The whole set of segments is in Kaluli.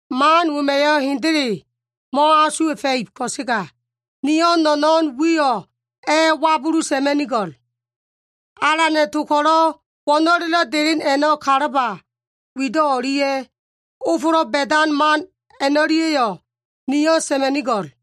Man wema꞉yo꞉ hendele mo꞉asuwa꞉fa꞉ib ko꞉sega, niyo꞉ no꞉no꞉n wiyo꞉ a꞉wabuluma꞉nigo꞉l. Alana꞉ to ko꞉lo꞉ wo꞉no꞉lelo꞉ delen a꞉no꞉ kalaba wido꞉ o꞉lia꞉, ofolo꞉ ba꞉dan man a꞉no꞉lia꞉yo꞉ niyo꞉ sa꞉ma꞉nigo꞉l.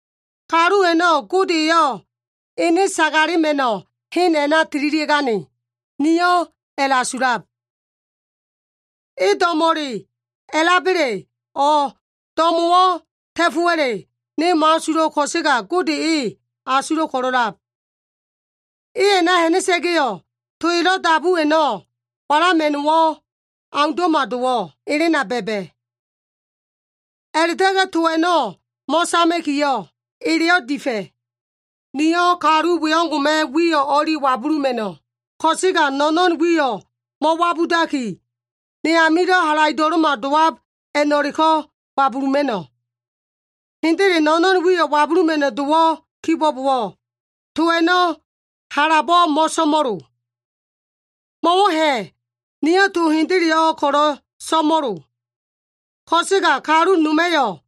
Kalu a꞉no꞉ Gode eyo꞉ ene sagalema꞉no꞉ hen a꞉na tililia꞉gane, niyo꞉ a꞉la꞉asulab. E do꞉mo꞉le a꞉laba꞉le, o꞉ do꞉mo꞉wo꞉ ta꞉fo꞉wa꞉le, ne mo꞉asulo꞉ ko꞉sega Gode e asulo꞉ ko꞉lo꞉lab. E a꞉na ha꞉na꞉sa꞉ga꞉yo꞉, to elo꞉ dabu a꞉no꞉ walama꞉no꞉wo꞉ aundo꞉ma dowo꞉ elena ba꞉ba꞉. A꞉la꞉ta꞉ga꞉ to a꞉no꞉ mo꞉sama꞉kiyo꞉, eleyo꞉ difa꞉. Niyo꞉ kalu we o꞉ngo꞉ma꞉ wiyo꞉ o꞉li wabuluma꞉no꞉, ko꞉sega no꞉no꞉n wiyo꞉ mo꞉wabudaki, ne amilo꞉ halaido꞉lo꞉ma dowab a꞉no꞉leko꞉ wabuluma꞉no꞉. Hendele no꞉no꞉n wiyo꞉ wabuluma꞉no꞉ dowo꞉ kibo꞉bowo꞉, to a꞉no꞉ halabo꞉ mo꞉so꞉mo꞉lo. Mo꞉wo꞉ ha꞉, niyo꞉ to hendeleyo꞉ ko꞉lo꞉ so꞉mo꞉lo. Ko꞉sega kalu noma꞉yo꞉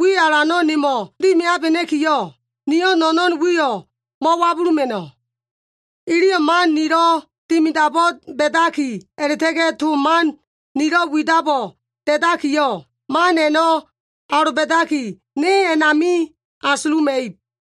wi alano꞉ nemo꞉ dimiabena꞉kiyo꞉, niyo꞉ no꞉no꞉n wiyo꞉ mo꞉wabuluma꞉no꞉. Iliyo꞉ man nilo꞉ dimidabo꞉ ba꞉daki a꞉la꞉ta꞉ga꞉ to man nilo꞉ widabo꞉ da꞉dakiyo꞉, man a꞉no꞉ aloba꞉daki ne a꞉nami asuluma꞉ib.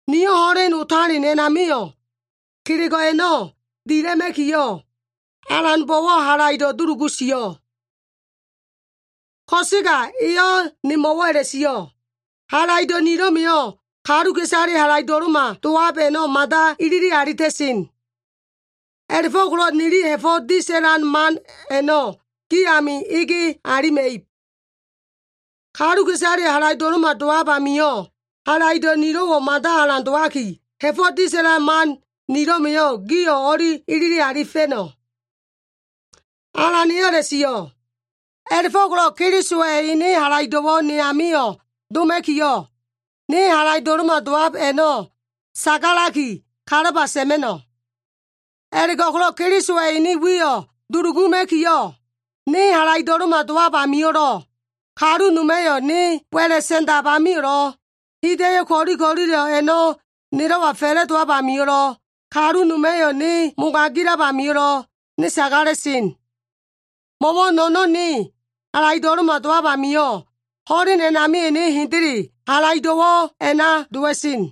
Niyo꞉ ho꞉len otalen a꞉namio꞉, kelego꞉ a꞉no꞉ dila꞉ma꞉kiyo꞉, Alanbo꞉wo꞉ halaido꞉ dulugu sio꞉. Ko꞉sega eyo꞉ nemo꞉wo꞉ a꞉la꞉sio꞉, “Halaido꞉ nilo꞉ma꞉yo꞉ kaluka꞉isale halaido꞉lo꞉ma dowab a꞉no꞉ mada ilili alita꞉sen. A꞉la꞉fo꞉ko꞉lo꞉ nili ha꞉fo꞉ disa꞉lan man a꞉no꞉ gi ami ege alima꞉ib. Kaluka꞉isaleyo꞉ halaido꞉lo꞉ma dowab amio꞉, halaido꞉ nilo꞉wo꞉ mada alan dowaki, ha꞉fo꞉ disa꞉lan man nilo꞉ma꞉yo꞉ gio꞉ o꞉li ilili alifa꞉no꞉.” Alan eyo꞉ a꞉la꞉sio꞉. A꞉la꞉fo꞉ko꞉lo꞉ Kelisowa꞉ ene halaido꞉wo꞉ ne amio꞉ doma꞉kiyo꞉, ne halaido꞉lo꞉ma dowab a꞉no꞉ sagalaki kalaba sa꞉ma꞉no꞉. A꞉la꞉go꞉ko꞉lo꞉ Kelisowa꞉ ene wiyo꞉ duluguma꞉kiyo꞉, ne halaido꞉lo꞉ma dowab amio꞉lo꞉, kalu noma꞉yo꞉ ne wa꞉la꞉ sa꞉ndab amio꞉lo꞉, hida꞉yo꞉ ko꞉li ko꞉lilo꞉ a꞉no꞉ nelo꞉wa fa꞉la꞉dowab amio꞉lo꞉, kalu noma꞉yo꞉ ne mogagilab amio꞉lo꞉, ne sagala꞉sen. Mo꞉wo꞉ no꞉no꞉n ne halaido꞉lo꞉ma dowab amio꞉, ho꞉len a꞉namio꞉ ne hendele halaido꞉wo꞉ a꞉na dowa꞉sen.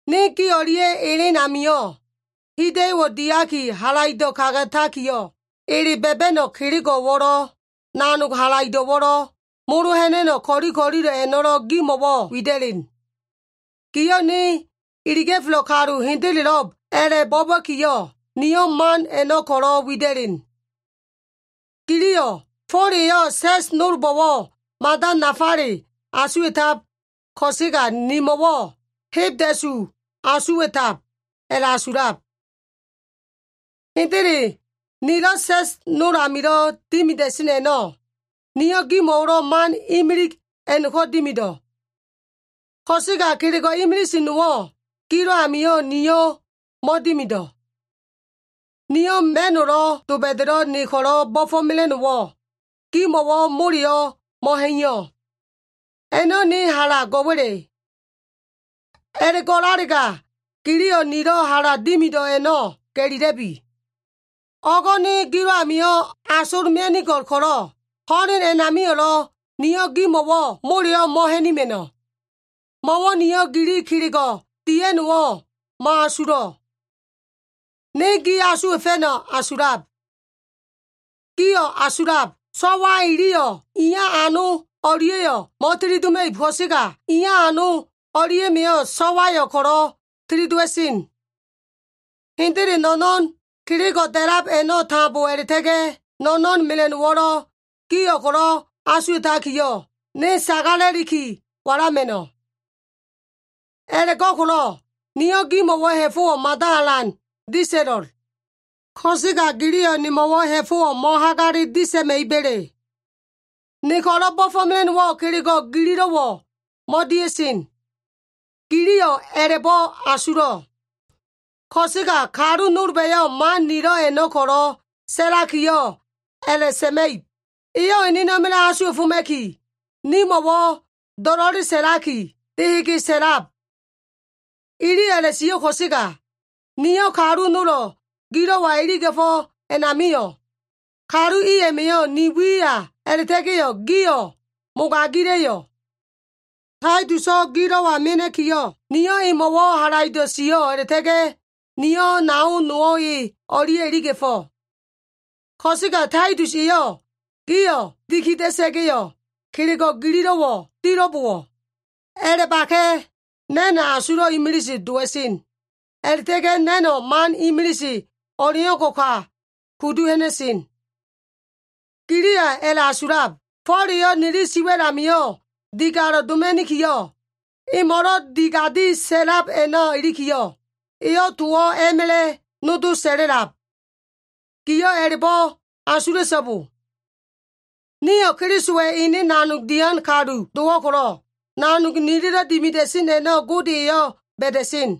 Ne gi o꞉lia꞉ elen amio꞉, hida꞉yo꞉wo꞉ diaki halaido꞉ kagatakiyo꞉, ele ba꞉ba꞉no꞉ kelego꞉wo꞉lo꞉, nanog halaido꞉wo꞉lo꞉, molo ha꞉na꞉no꞉ ko꞉li ko꞉lilo꞉ a꞉no꞉lo꞉ gimo꞉wo꞉ wida꞉len. Gio꞉ ne iliga꞉felo꞉ kalu hendelo꞉b a꞉la꞉bo꞉ba꞉kiyo꞉, niyo꞉ man a꞉no꞉ ko꞉lo꞉ wida꞉len. Giliyo꞉, “Fo꞉l eyo꞉ sa꞉s nolbo꞉wo꞉ mada nafale asuwa꞉tab ko꞉sega nimo꞉wo꞉ hebda꞉su asuwa꞉tab,” a꞉la꞉asulab. Hendele nilo꞉ sa꞉s nol amilo꞉ dimida꞉sen a꞉no꞉, niyo꞉ gimo꞉wo꞉lo꞉ man imilig a꞉no꞉ko꞉ dimido꞉. Ko꞉sega kelego꞉ imilise nowo꞉ gilo꞉ amio꞉ niyo꞉ mo꞉dimido꞉. Niyo꞉ ma꞉no꞉lo꞉ doba꞉da꞉lo꞉ ne ko꞉lo꞉ bo꞉fo꞉mela꞉no꞉wo꞉ gimo꞉wo꞉ moleyo꞉ mo꞉ha꞉iyo꞉. A꞉no꞉ ne hala go꞉wa꞉le? A꞉la꞉go꞉lalega giliyo꞉ nilo꞉ hala dimido꞉ a꞉no꞉ ga꞉lila꞉bi. O꞉go꞉ ne gilo꞉ amio꞉ asol mia꞉nigo꞉l ko꞉lo꞉, ho꞉len a꞉namio꞉lo꞉ niyo꞉ gimo꞉wo꞉ moleyo꞉ mo꞉ha꞉nima꞉no꞉. Mo꞉wo꞉ niyo꞉ gili kelego꞉ dia꞉no꞉wo꞉ mo꞉asulo꞉. Ne gi asuwa꞉fa꞉no꞉ asulab. Gio꞉ asulab, so꞉wa iliyo꞉ iya ano o꞉lia꞉yo꞉ mo꞉tilidoma꞉ib ko꞉sega, iya ano o꞉lia꞉ma꞉yo꞉ so꞉wayo꞉ ko꞉lo꞉ tilidowa꞉sen. Hendele, no꞉no꞉n kelego꞉ da꞉lab a꞉no꞉ tambo a꞉la꞉ta꞉ga꞉, no꞉no꞉n mela꞉no꞉wo꞉lo꞉, gio꞉ ko꞉lo꞉ asuwa꞉takiyo꞉, ne sagala꞉liki wala꞉ma꞉no꞉. A꞉la꞉go꞉ko꞉lo꞉, niyo꞉ gimo꞉wo꞉ ha꞉fo꞉wo꞉ mada alan disa꞉lo꞉l. Ko꞉sega giliyo꞉ nemo꞉wo꞉ ha꞉fo꞉wo꞉ mo꞉hagale disa꞉ma꞉iba꞉le? Ne ko꞉lo꞉ bo꞉fo꞉mela꞉no꞉wo꞉ kelego꞉ gililo꞉wo꞉ mo꞉dia꞉sen. Giliyo꞉ a꞉la꞉bo꞉ asulo꞉. Ko꞉sega kalu nolba꞉yo꞉ man nilo꞉ a꞉no꞉ ko꞉lo꞉ sa꞉lakiyo꞉ a꞉la꞉sa꞉ma꞉ib, “Eyo꞉ enena꞉ma꞉la꞉ asuwa꞉foma꞉kiyo꞉, nimo꞉wo꞉ do꞉lo꞉le sa꞉laki, dehege sa꞉lab.” Iliyo꞉ a꞉la꞉sio꞉ ko꞉sega, niyo꞉ kalu nolo꞉ gilo꞉wa iliga꞉fo꞉ a꞉namio꞉, kalu i a꞉ma꞉yo꞉ ni wiya a꞉la꞉ta꞉ga꞉yo꞉, gio꞉ mogagila꞉yo꞉? Taituso꞉ gilo꞉wa mena꞉kiyo꞉, niyo꞉ emo꞉wo꞉ halaido꞉ sio꞉ a꞉la꞉ta꞉ga꞉ niyo꞉ nao nowo꞉ e o꞉lia꞉ iliga꞉fo꞉. Ko꞉sega Taitus eyo꞉ gio꞉ dikida꞉sa꞉ga꞉yo꞉ kelego꞉ gililo꞉wo꞉ dilo꞉bowo꞉? A꞉la꞉baka꞉! Na꞉no꞉ asulo꞉ imilise dowa꞉sen. A꞉la꞉ta꞉ga꞉ na꞉no꞉ man imilise o꞉leo꞉ngo꞉ ka kudu ha꞉na꞉sen. Giliyo꞉ a꞉la꞉asulab, “Fo꞉l eyo꞉ nili siwa꞉l amio꞉ digalo꞉ doma꞉nikiyo꞉, emo꞉lo꞉ diga꞉di sa꞉lab a꞉na ilikiyo꞉, eyo꞉ towo꞉ a꞉ma꞉la꞉ nodo sa꞉la꞉lab.” Gio꞉ a꞉la꞉bo꞉ asula꞉so꞉bo. Nio꞉ Kelisowa꞉ ene nanog dian kalu dowo꞉ ko꞉lo꞉, nanog nililo꞉ dimida꞉sen a꞉no꞉ Gode eyo꞉ ba꞉da꞉sen.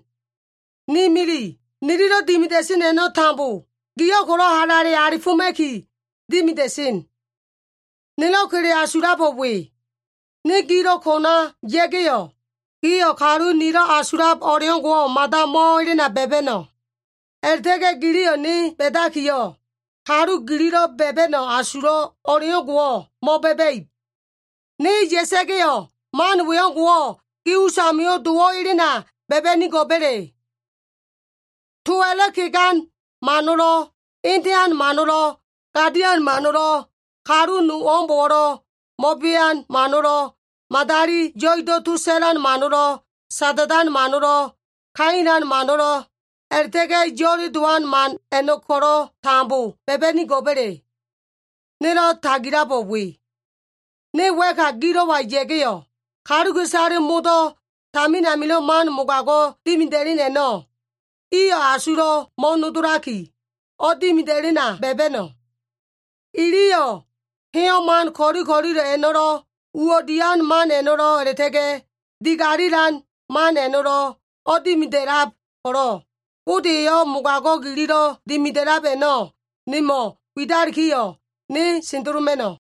Ni mili, nililo꞉ dimida꞉sen a꞉no꞉ tambo, gio꞉ ko꞉lo꞉ halale alifoma꞉ki dimida꞉sen. Nelo꞉ kele asulabo꞉ we. Ne gilo꞉ kona ya꞉ga꞉yo꞉, gio꞉ kalu nilo꞉ asulab o꞉leo꞉ngo꞉wo꞉ mada mo꞉elena ba꞉ba꞉no꞉. A꞉la꞉ta꞉ga꞉ giliyo꞉ ne ba꞉dakiyo꞉, kalu gililo꞉ ba꞉ba꞉no꞉ asulo꞉ o꞉leo꞉ngo꞉wo꞉ mo꞉ba꞉ba꞉ib. Ne ya꞉sa꞉ga꞉yo꞉ man we o꞉ngo꞉wo꞉ gi usamio꞉ dowo꞉ elena ba꞉ba꞉nigo꞉ba꞉le? Towa꞉lo꞉ kegan mano꞉lo꞉, etean mano꞉lo꞉, gadian mano꞉lo꞉, kalu nowo꞉mbo꞉lo꞉ mo꞉bean mano꞉lo꞉, madali yo꞉ido꞉ to sa꞉lan mano꞉lo꞉, sada꞉dan mano꞉lo꞉, kailan mano꞉lo꞉, a꞉la꞉ta꞉ga꞉ yo꞉le dowan man a꞉no꞉ ko꞉lo꞉ tambo ba꞉ba꞉nigo꞉ba꞉le? Nelo꞉ tagilabo꞉ we. Ne wa꞉ka gilo꞉wa ya꞉ga꞉yo꞉, kaluka꞉isale modo꞉ tamin amilo꞉ man mogago꞉ dimida꞉len a꞉no꞉, iyo꞉ asulo꞉ mo꞉nodolaki, o꞉dimida꞉lena ba꞉ba꞉no꞉. Iliyo꞉ heyo꞉ man ko꞉li ko꞉lilo꞉ a꞉no꞉lo꞉, uwo꞉ dian man a꞉no꞉lo꞉, a꞉la꞉ta꞉ga꞉ digalilan man a꞉no꞉lo꞉ o꞉dimida꞉lab ko꞉lo꞉, Gode eyo꞉ mogago꞉ gililo꞉ dimida꞉lab a꞉no꞉ nemo꞉ widalikiyo꞉, ne sendeloma꞉no꞉.